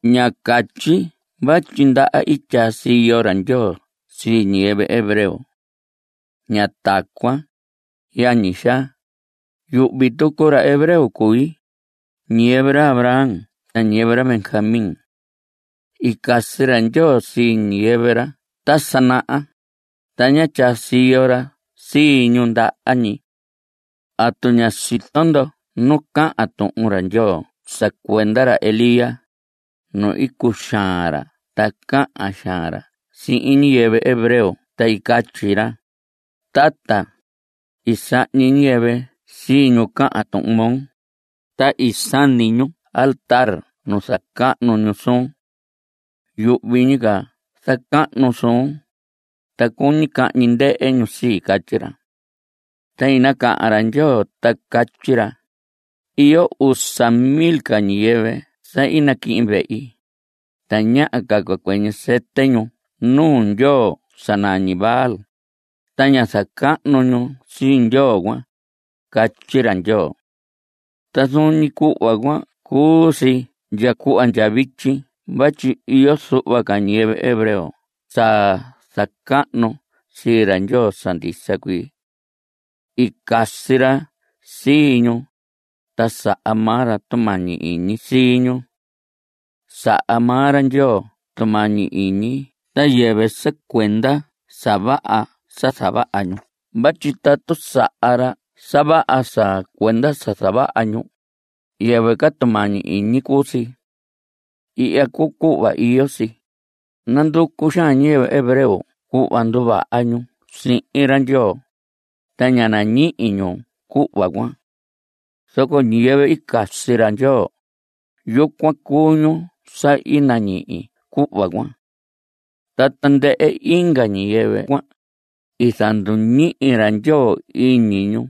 Ña catyi vatyi ndaha i tyaa siyo ra Ndyoo sii ñiyɨvɨ hebreo. Ña tacuan, yañi xaa. Yuhvi tucu ra hebreo cui, ñiyɨvɨ ra Abraham ta ñiyɨvɨ ra Benjamín. I casi ra Ndyoo sii ñiyɨvɨ ra ta sa naha, ta ñá tyaa siyo ra sii ñu ndaha ñi. ¿Atu ña sito ndo nu cahan Tuhun ra Ndyoo sa cuenda ra Elías? nu i cuxaan ra ta cahan xaan ra sii ñiyɨvɨ hebreo ta i catyi ra: “Tata, i sahñi ñiyɨvɨ sii ñu cahan tuhun moo, ta i sani ñu altar nu i zacahnu ñu suun. Yuhvi ñi ca zacahnu suun, ta cuñi cahñi ndɨhɨ ñu sii”, catyi ra. Ta i nacahan ra Ndyoo ta catyi ra: “Iyo usa mil ca ñiyɨvɨ sa i naquihin vehi. Tañaha ca cua cuɨñɨ sɨtɨ ñu nuu ndyoo sa nañi Baal, ta ña zacahnu ñu sii ndyoo cuan”, catyi ra Ndyoo. Ta zuun ñi cuhva cuan cuu si ndya cuhva ndya vityi vatyi iyo zuhva ca ñiyɨvɨ hebreo sa zacahnu sii ra Ndyoo sa ndisa cuii. I casi ra sii ñu, ta saha maa ra tumañi iñi sii ñu. Saha maa ra Ndyoo tumañi iñi ta yɨvɨ sa cuenda sa vaha sa zavaha ñu vatyi tatu saha ra sa vaha sa cuenda sa zavaha ñu, yɨvɨ ca tumañi iñi cuu si. Ihya cuu cuhva iyo si. Nanducu xaan ñiyɨvɨ hebreo cuhva nduvaha ñu sihin ra Ndyoo, ta ña nañihi ñu cuhva cuan. Zoco ñiyɨvɨ i casi ra Ndyoo, yucuan cuu ñu sa i nañihi cuhva cuan. Ta tandɨhɨ inga ñiyɨvɨ cuan, i zanduñihi ra Ndyoo iñi ñu.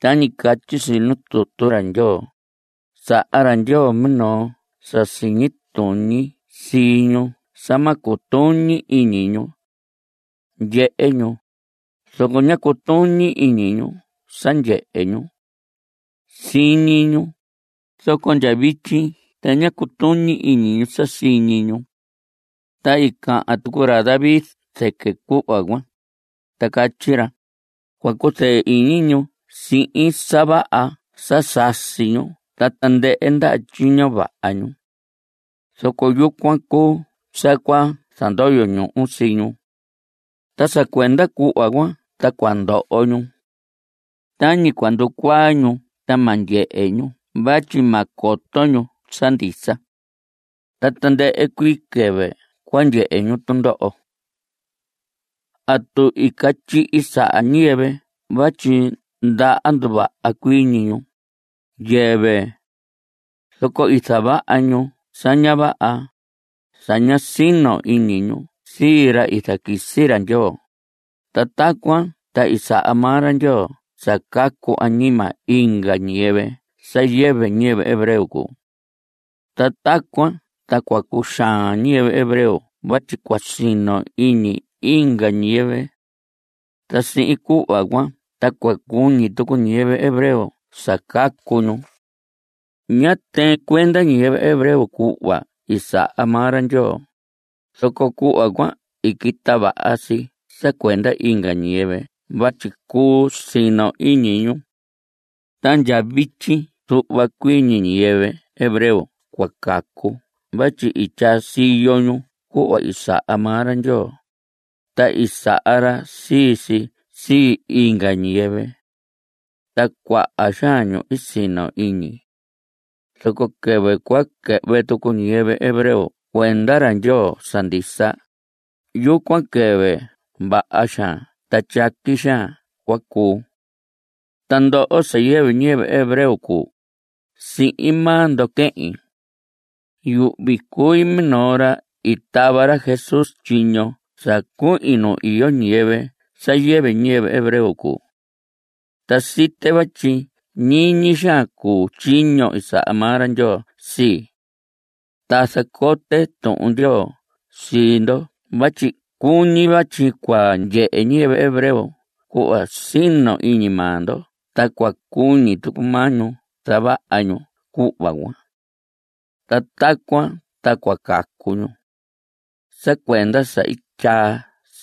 Tañi catyi si nuu tutu ra Ndyoo: “Saha ra Ndyoo minoo sa siñi tuñi sii ñu sa ma cutuñi iñi ñu. Ndyehe ñu, zoco ña cutuñi iñi ñu sa ndyehe ñu. Siñi ñu, zoco ndya vityi ta ña cutuñi iñi ñu sa siñi ñu.” Ta i cahan tucu ra David zɨquɨ cuhva cuan, ta catyi ra: Cua cuzɨɨ iñi ñu sihin sa vaha sa sasi ñu ta tandɨhɨ ndaha tyiño vaha ñu. Zoco yucuan cuu sa cua zandoyo ñuhu sii ñu. Ta sa cuenda cuhva cuan ta cua ndoho ñu. Tañi cua nducuaa ñu ta ma ndyehe ñu vatyi ma coto ñu sa ndisa. Ta tandɨhɨ cuii quɨvɨ cua ndyehe ñu tundoho. ¿Atu i catyihi saha ñiyɨvɨ vatyi ndaha nduva cuii ñu? Yɨvɨ. Zoco i zavaha ñu sa ña vaha (sa ñá sino iñi ñu sii ra i zaquisi ra Ndyoo), ta tacuan ta i saha maa ra Ndyoo sa cacu añima inga ñiyɨvɨ sa yɨvɨ ñiyɨvɨ hebreo cuu. Ta tacuan ta cua cuxaan ñiyɨvɨ hebreo vatyi cua sino iñi inga ñiyɨvɨ. Ta sihin cuhva cuan ta cua cuñi tucu ñiyɨvɨ hebreo sa cacu ñu. Ñá tɨɨn cuenda ñiyɨvɨ hebreo cuhva i saha maa ra Ndyoo, zoco cuhva cuan i quita vaha si sa cuenda inga ñiyɨvɨ vatyi cuu sino iñi ñu. Ta ndya vityi zuhva cuii ñi ñiyɨvɨ hebreo cua cacu vatyi i tyaa siyo ñu cuhva i saha maa ra Ndyoo, ta i saha ra sii si sii inga ñiyɨvɨ. Ta cuaha xaan ñu i sino iñi. Zoco quɨvɨ cua quɨhvɨ tucu ñiyɨvɨ hebreo cuenda ra Ndyoo sa ndisa, yucuan quɨvɨ vaha xaan ta tyaqui xaan cua cuu. Ta ndoho sa yɨvɨ ñiyɨvɨ hebreo cuu, sihin maa ndo quehin. Yuhvi cui minoo ra i tava ra Jesús tyiño sa cuhin nu iyo ñiyɨvɨ sa yɨvɨ ñiyɨvɨ hebreo cuu. Ta site vatyi ñiñi xaan cuu tyiño i saha maa ra Ndyoo sii. Ta zacote Tuhun Ndyoo sii ndo vatyi cuñi vatyi cua ndyehe ñiyɨvɨ hebreo cuhva sino iñi maa ndo ta cua cuñi tucu maa ñu zavaha ñu cuhva cuan. Ta tacuan ta cua cacu ñu. Sa cuenda sa i tyaa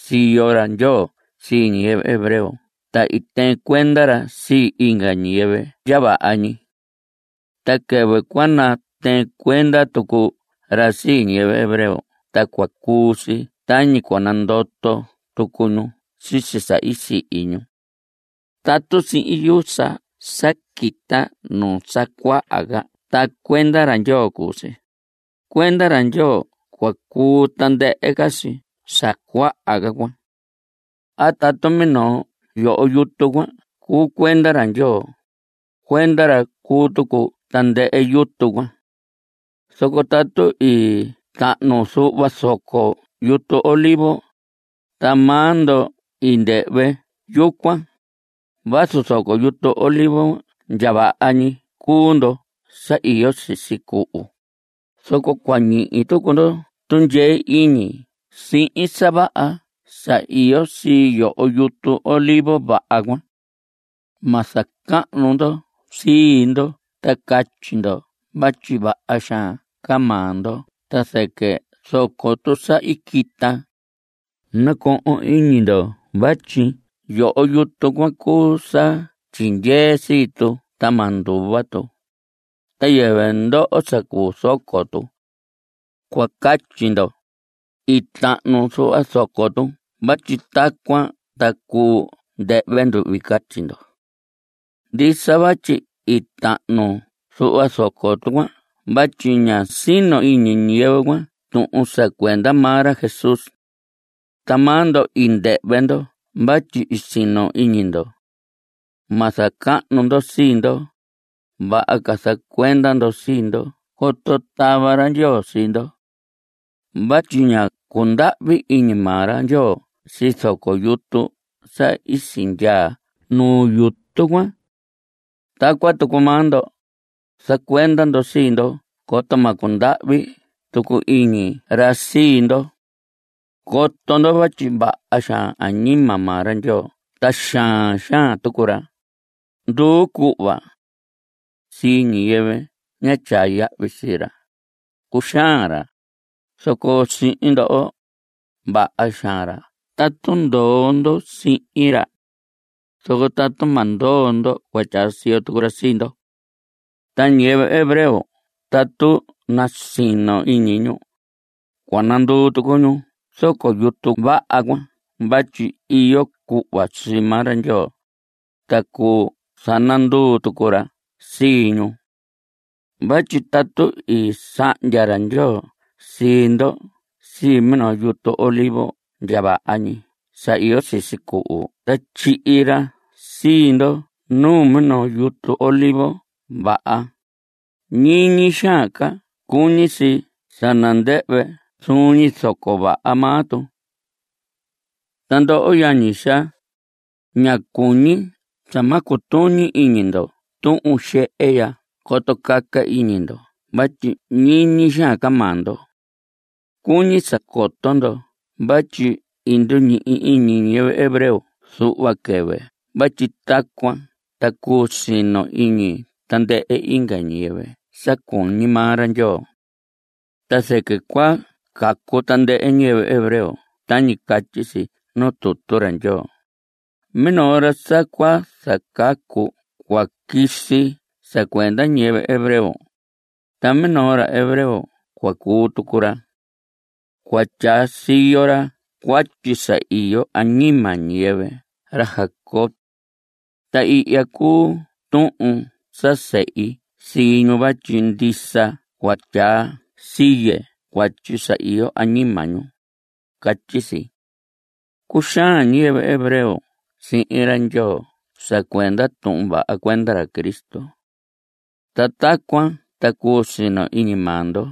siyo ra Ndyoo sii ñiyɨvɨ hebreo ta i tɨɨn cuenda ra sii inga ñiyɨvɨ ndya vaha ñi. Ta quɨvɨ cua natɨɨn cuenda tucu ra sii ñiyɨvɨ hebreo ta cua cuu si tañi cua nandoto tucu ñu sisi sa i sihi ñu. Tatu siin yusa sa quita nuu sa cuaha cuan ta cuenda ra Ndyoo cuu si, cuenda ra Ndyoo cua cuu tandɨhɨ ca si sa cuaha ca cuan. A tatu minoo yoho yutu cuan cuu cuenda ra Ndyoo, cuenda ra cua cuu tucu tandɨhɨ yutu cuan. Zoco tatu i tahnu zuhva zoco yutu olivos, ta maa ndo i ndɨhvɨ yucuan, vazu zoco yutu olivos ndya vaha ñi cuu ndo sa iyo sisi cuhu, zoco cua ñihi tucu ndo tundyee iñi sihin sa vaha sa iyo sii yoho yutu olivos vaha cuan. Ma zacahnu ndo sii ndo ta catyi ndo vatyi vaha xaan ca maa ndo ta zɨquɨ zoco tu sa i quita. Nacohon iñi ndo vatyi yoho yutu cuan cuu sa tyindyee sii tu ta ma nduva tu, ta yɨvɨ ndoho sa cuu zoco tu. Cua catyi ndo: “I tahnu zuhva zoco tu vatyi tacuan ta cuu ndɨhvɨ nduhvi”, catyi ndo. Ndisa vatyi i tahnu zuhva zoco tu cuan vatyi ña sino iñi ñiyɨvɨ cuan tuhun sa cuenda maa ra Jesús. Ta maa ndo i ndɨhvɨ ndo vatyi i sino iñi ndo. Ma zacahnu ndo sii ndo. Vaha ca zacuenda ndo sii ndo coto tava ra Ndyoo sii ndo. Vatyi ñá cundahvi iñi maa ra Ndyoo sii zoco yutu sa i sindyaa nu yutu cuan. Tacuan tucu maa ndo, zacuenda ndo sii ndo coto ma cundahvi tucu iñi ra sii ndo. Coto ndo vatyi vaha xaan añima maa ra Ndyoo ta xaan xaan tucu ra, nduu cuhva. Sii ñiyɨvɨ ña tyaa yahvi sii ra, cuxaan ra. Zoco sihin ndoho, vaha xaan ra tatu ndoo ndo sihin ra. Zoco tatu ma ndoo ndo cua tyaa siyo tucu ra sii ndo. Ta ñiyɨvɨ hebreo tatu nasino iñi ñu, cua nanduu tucu ñu zoco yutu vaha cuan vatyi iyo cuhva sii maa ra Ndyoo, ta cuu zananduu tucu ra sii ñu. Vatyi tatu i sahndya ra Ndyoo sii ndo sii minoo yutu olivos ndya vaha ñi sa iyo sisi cuhu ta tyihi ra sii ndo nuu minoo yutu olivos vaha, ñiñi xaan ca cuñi si sa nandɨhvɨ zuun ñi zoco vaha maa tu. Ta ndoho yañi xaa, ña cuñi sa ma cutuñi iñi ndo tuhun xehe ya coto caca iñi ndo vatyi ñiñi xaan ca maa ndo. Cuñi sa coto ndo vatyi i nduñihi iñi ñiyɨvɨ hebreo zuhva quɨvɨ vatyi tacuan ta cuu sino iñi tandɨhɨ inga ñiyɨvɨ sa cuñi maa ra Ndyoo. Ta zɨquɨ cua cacu tandɨhɨ ñiyɨvɨ hebreo tañi catyi si nuu tutu ra Ndyoo: Minoo ra sa cua zacacu cua quisi sa cuenda ñiyɨvɨ hebreo, ta minoo ra hebreo cua cuu tucu ra. Cua tyaa siyo ra cuatyi sa iyo añima ñiyɨvɨ ra Jacob. Ta ihya cuu tuhin sa sehi sii ñu vatyi ndisa cua tyaa siye cuatyi sa iyo añima ñu, catyi si. Cuxaan ñiyɨvɨ hebreo sihin ra Ndyoo sa cuenda tuhun vaha cuenda ra Cristo. Ta tacuan ta cuu sino iñi maa ndo.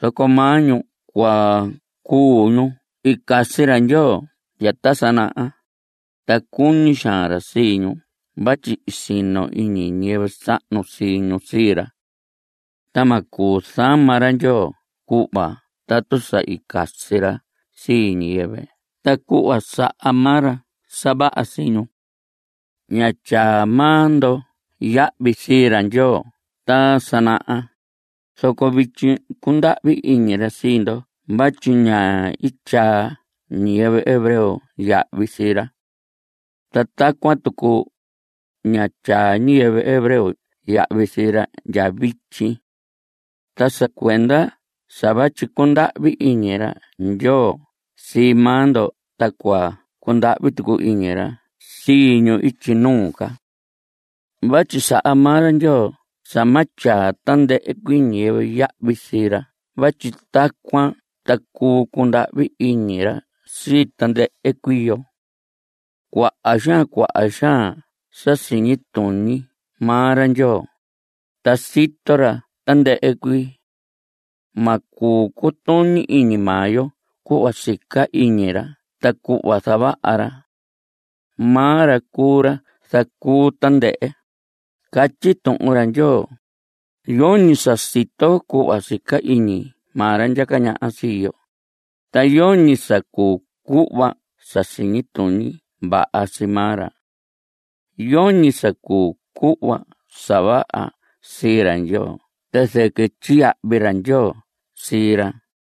Zoco maa ñu cuan cuu ñu i casi ra Ndyoo ndya ta sa naha, ta cuñi xaan ra sii ñu vatyi i sino iñi ñiyɨvɨ sahnu sii ñu sii ra. Ta ma cuu zama ra Ndyoo cuhva tatu sa i casi ra sii ñiyɨvɨ ta cuhva saha maa ra sa vaha sii ñu. Ñá tyaa maa ndo yahvi sii ra Ndyoo ta sa naha, zoco vityi cundahvi iñi ra sii ndo vatyi ñá i tyaa ñiyɨvɨ hebreo yahvi sii ra. Ta tacuan tucu, ña tyaa ñiyɨvɨ hebreo yahvi sii ra ndya vityi. Ta sa cuenda sa vatyi cundahvi iñi ra Ndyoo sii maa ndo ta cua cundahvi tucu iñi ra sii ñu ityi nuu ca. Vatyi saha maa ra Ndyoo sa ma tyaa tandɨhɨ cuii ñiyɨvɨ yahvi sii ra vatyi tacuan ta cuu cundahvi iñi ra sii tandɨhɨ cuii yo. Cuaha xaan cuaha xaan sa siñi tuñi maa ra Ndyoo, ta sito ra tandɨhɨ cuii. Ma cuu cutuñi iñi maa yo cuhva sica iñi ra ta cuhva zavaha ra. Maa ra cuu ra zacuu tandɨhɨ. Catyi Tuhun ra Ndyoo: “Yoñi sa sito cuhva sica iñi maa ra ndyaca ñaha sii yo, ta yoñi sa cuu cuhva sa siñi tuñi vaha sii maa ra. Yoñi sa cuu cuhva sa vaha sii ra Ndyoo ta zɨquɨ tyiyahvi ra Ndyoo sii ra.”